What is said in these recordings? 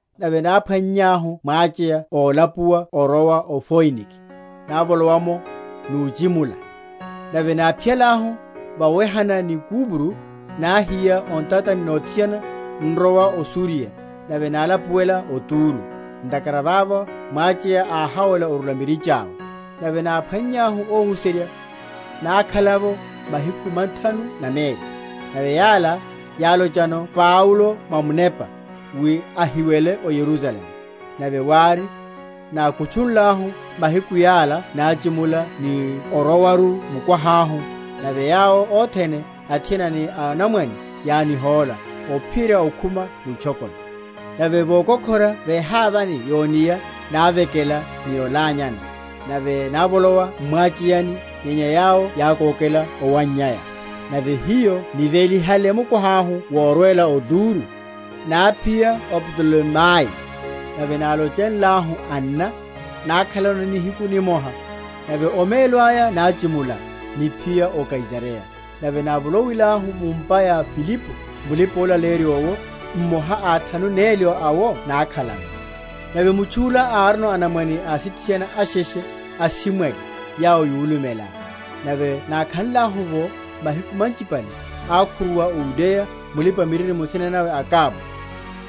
nave náphwannyahu mwacheya ólapuwa orowa o Foinike, návolowa’mo, nuchi?-?mula. Nave náphiyalahu vowehana ni Kupro, náhiya o ntatani nothiana, n’rowa o Suriya; nave nálapuwela o Turo; ntakhara vavo mwacheya áháwela orula mirichi awe. Nave náphwannyahu óhuserya, nákhala‐’wo mahiku mathanu na meli; nave yala yálochano Paulo mwa Munepa, wi ahiwele o Yerusalemu. Nave wári nákutchunlahu mahiku yala, náchimula ni orowaru mukwaha’hu; nave yawo othene, athiana ni anamwanene yánihóla ophiyerya okhuma mwitchokoni; nave vokokhora vehavani yo’nia, návekela, ni olanyana; nave návolowa m’mwacheyani, nyenya yawo yákókela owannyaya. Nave hiyo nivelihale mukwaha’hu worwela o Turo, náphiya o Ptolemayi; nave nálochenlahu anna, nákhalano nihiku nimoha. Nave omelo aya náchimula, niphiya o Kaisareya, nave návolowilahu mu’mpa ya Filipo mulipa‐olaleyerya owo, mmoha a athanu neli awo, nákhalano. Nave mutchu’la árino anamwane asithiana asheshe, asimwali, yawo yulumela. Nave nákhanlahu’vo mahiku manchipale, ákhuruwa o Yudeya mulipa‐miririmo, nsina nawe Agabo.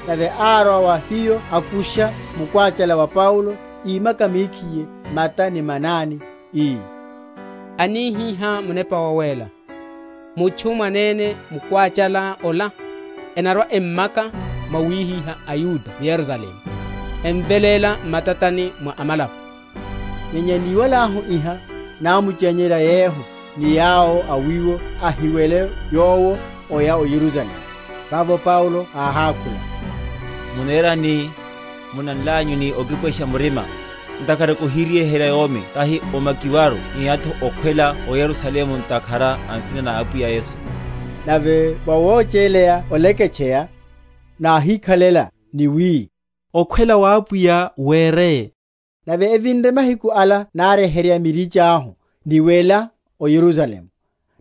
Nave árwa wa hiyo akusha mukwáchala wa Paulo, ímaka mekhiye mata ni manani, ii, Anihihá Munepa Wawéla, Mutchu mwanene mukwáchala ola, enarwa‐emmaka mwawihiha aYuda m’Yerusalemu, emveléla m’matani mwa amalapo. Nyenya niwalahu iha, námchenyerya yehu ni yawo a wiwo, ahiwele yowo oya o Yerusalemu. Vavo Paulo áhákhula, Munerani, munanlanyu ni okipwesha murima? ntakhara kohiryeherya yomi tahi omakiwaru, nyenya’tho okhwela o Yerusalemu ntakhara a nsina na Apwiya Yesu. Nave vawocheleya oleketcheya, náhikhalela, ni wi, Okhwela wa Apwiya wereye. Nave evinre mahiku ala náryeherya mirichi ahu, niwela o Yerusalemu.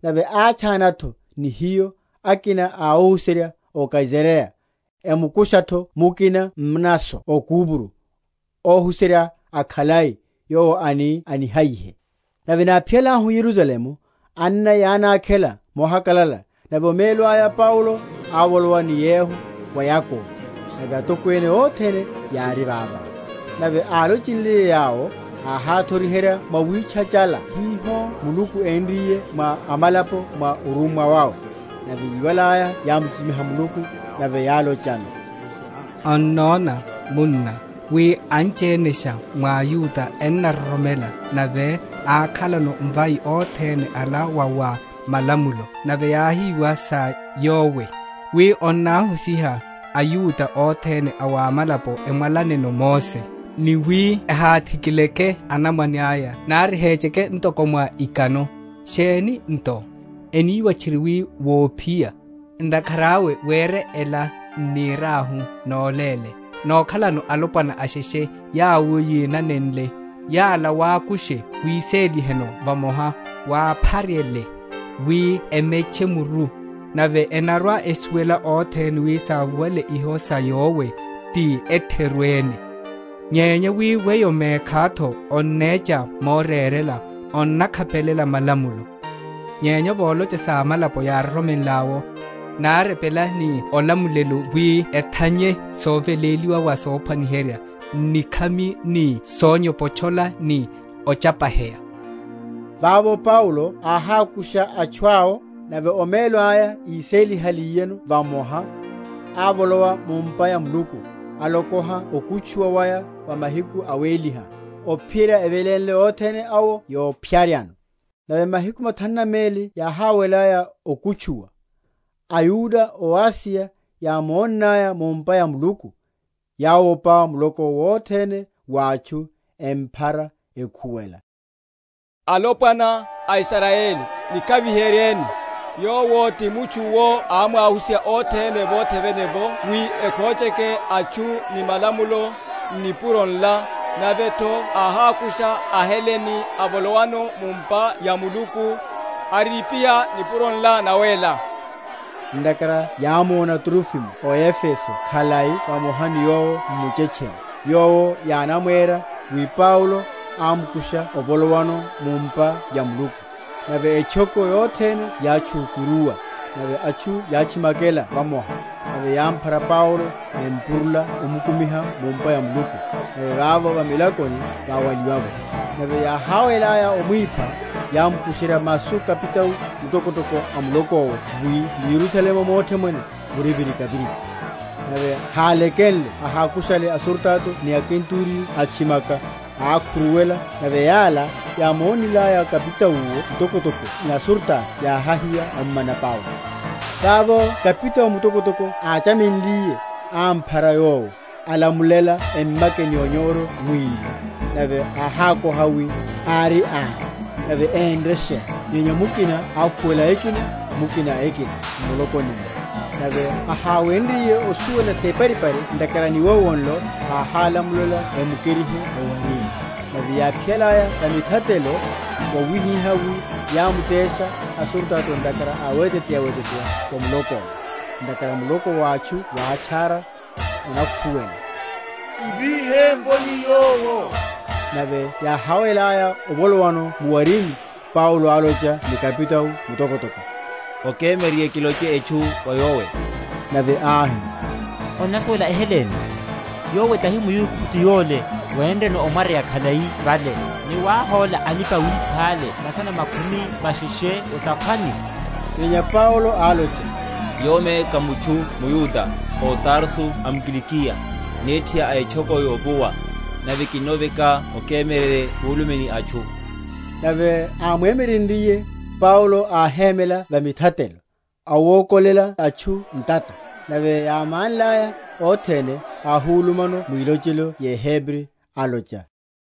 Nave átchana’tho ni hiyo akina a óhuserya ó Kaisareya, emukusha’tho mukina Mnaso o Kupro, óhuserya akhalai, yowo ani anihayihe. Nave náphiyalahu o Yerusalemu, anna yánákhela mohakalala. Nave omelo aya Paulo ávolowa ni yehu wa Yakobo; nave atokwene othene yári vavo. Nave álochenliye yawo, áháthoriherya mwawitchachála hiho Muluku énriye mwa amalapo mwa orummwa awe. Nave yíwalaya, yámuchichimiha Muluku; nave yálochano, Onnona, munna, wi anchienesha mwa aYuda ennaroromela; nave akhalano mvai othene ala wa wa malamulo; nave yáhiwa sa yowe, wi onnahusiha aYuda othene a wa amalapo emwalaneno Mose, ni wi ehathikileke anamwane aya, nari ehecheke ntoko mwa ikano. Sheni nto? eniwa tchiri wi wophiya. Ntakhara awe were ela n’niriahu noléle; nokhalano alopwana asheshe yawo yínanenle: yala wakushe wiséliheno vamoha, wápharyele, wi emetche muru; nave enarwa‐esuwela othene wi sávuwale iho sa yowe ti etheru ene, nyenya wi weyo mekhá’tho onnecha morerela, onakhapelela malamulo. Nyenya volocha sa amalapo yároromenl’awo, nárepela ni olamulela wi ethanye soveléliwa wa sophwaniherya, n’nikhami, ni sonyopotchola, ni ochapaheya. Vavo Paulo áhákusha atchu awo, nave omelo aya isélihaliyeno vamoha, ávolowa mu’mpa ya Muluku, alokoha okutchuwa waya wa mahiku awéliha, ophiyerya evelénle othene awo yopharyano. Nave mahiku mathanu na meli yáháwelaya okutchuwa, aYuda ó Asiya yámonnaya mu’mpa ya Muluku, yáwopa muloko wothene wa atchu, emphara, ekhuwela, Alopwana, a Israyeli, Nikhaviheryeni; Yowo ti mutchu’wo ámwahusiha othene vothe vene’vo wi ekhocheke atchu, ni malamulo, n’nipuro nla; nave’tho áhákusha aHelene avolowano mu’mpa ya Muluku, aripiha nipuro nla nawéla. Ntakhara yámona Trofimo ó Efeso khalai vamoha ni yowo m’muchetcheni; yowo yánamwera wi Paulo ámukusha ovolowano mu’mpa ya Muluku. Nave etchoko yothene yátchukuruwa, nave atchu yátchimakela vamoha; nave yámphara Paulo empurula omukumiha mu’mpa ya Muluku; nave vavo va milakoni váwaliwa’vo. Nave yáháwelaya omwipha, yámukusherya masu kapitao mutokotoko a muloko’wo wi m’Yerusalemu mothe mwene muri virikavirika. Nave hálekenle ahákushale asurutato ni akenturiyo, atchimaka, ákhuruwela; nave yala, yámonnaya kapitao mutokotoko ni asurutato yáhiya ommana Paulo. Vavo kapitao mutokotoko áchamenliye, ámphara yowo, alamulela emmake ni onyoro mwili; nave áhákoha, wi ári ani, nave énre sheni? Nyenya mukina ákhuwela ekina, mukina ekina, m’mulokoni’mmo, nave aháwenryiye osuwela separipari ntakhara a niwowo nlo, áhálamulela emukerihe o’warini. Nave yáphiyalaya va mithatelo, wahihihá wi yámutesha asurutato ntakhara a weteteya‐eteteya wa muloko’wo; ntakhara muloko wa atchu wátchara, onakhuwela, M’vihe’mvoni yowo. Nave yáháwelaya ovolowano mu’warini, Paulo álocha ni kapitao mutokotoko, Okemyererye kiloche etchu wa yowe? Nave áhi, Onnasuwela eHelene? Yowe tahi muAigupto yole, wénreno omwaryeya khalai vale, ni wahóla alipa‐wipha’le masana makhumi masheshe o’takhwani? Nyenya Paulo álocha, Yomi ká mutchu mYuda, ó Tarso a m’Kilikiya, nethi a etchoko yovuwa; nave kinnoveka okemyererye kulume n’atchu. Nave ámwemyerenryiye, Paulo áhemela va mithatelo, awokolela atchu ntata; nave yámánlaya othene, áhulumano mwilochelo yeHebri, alocha,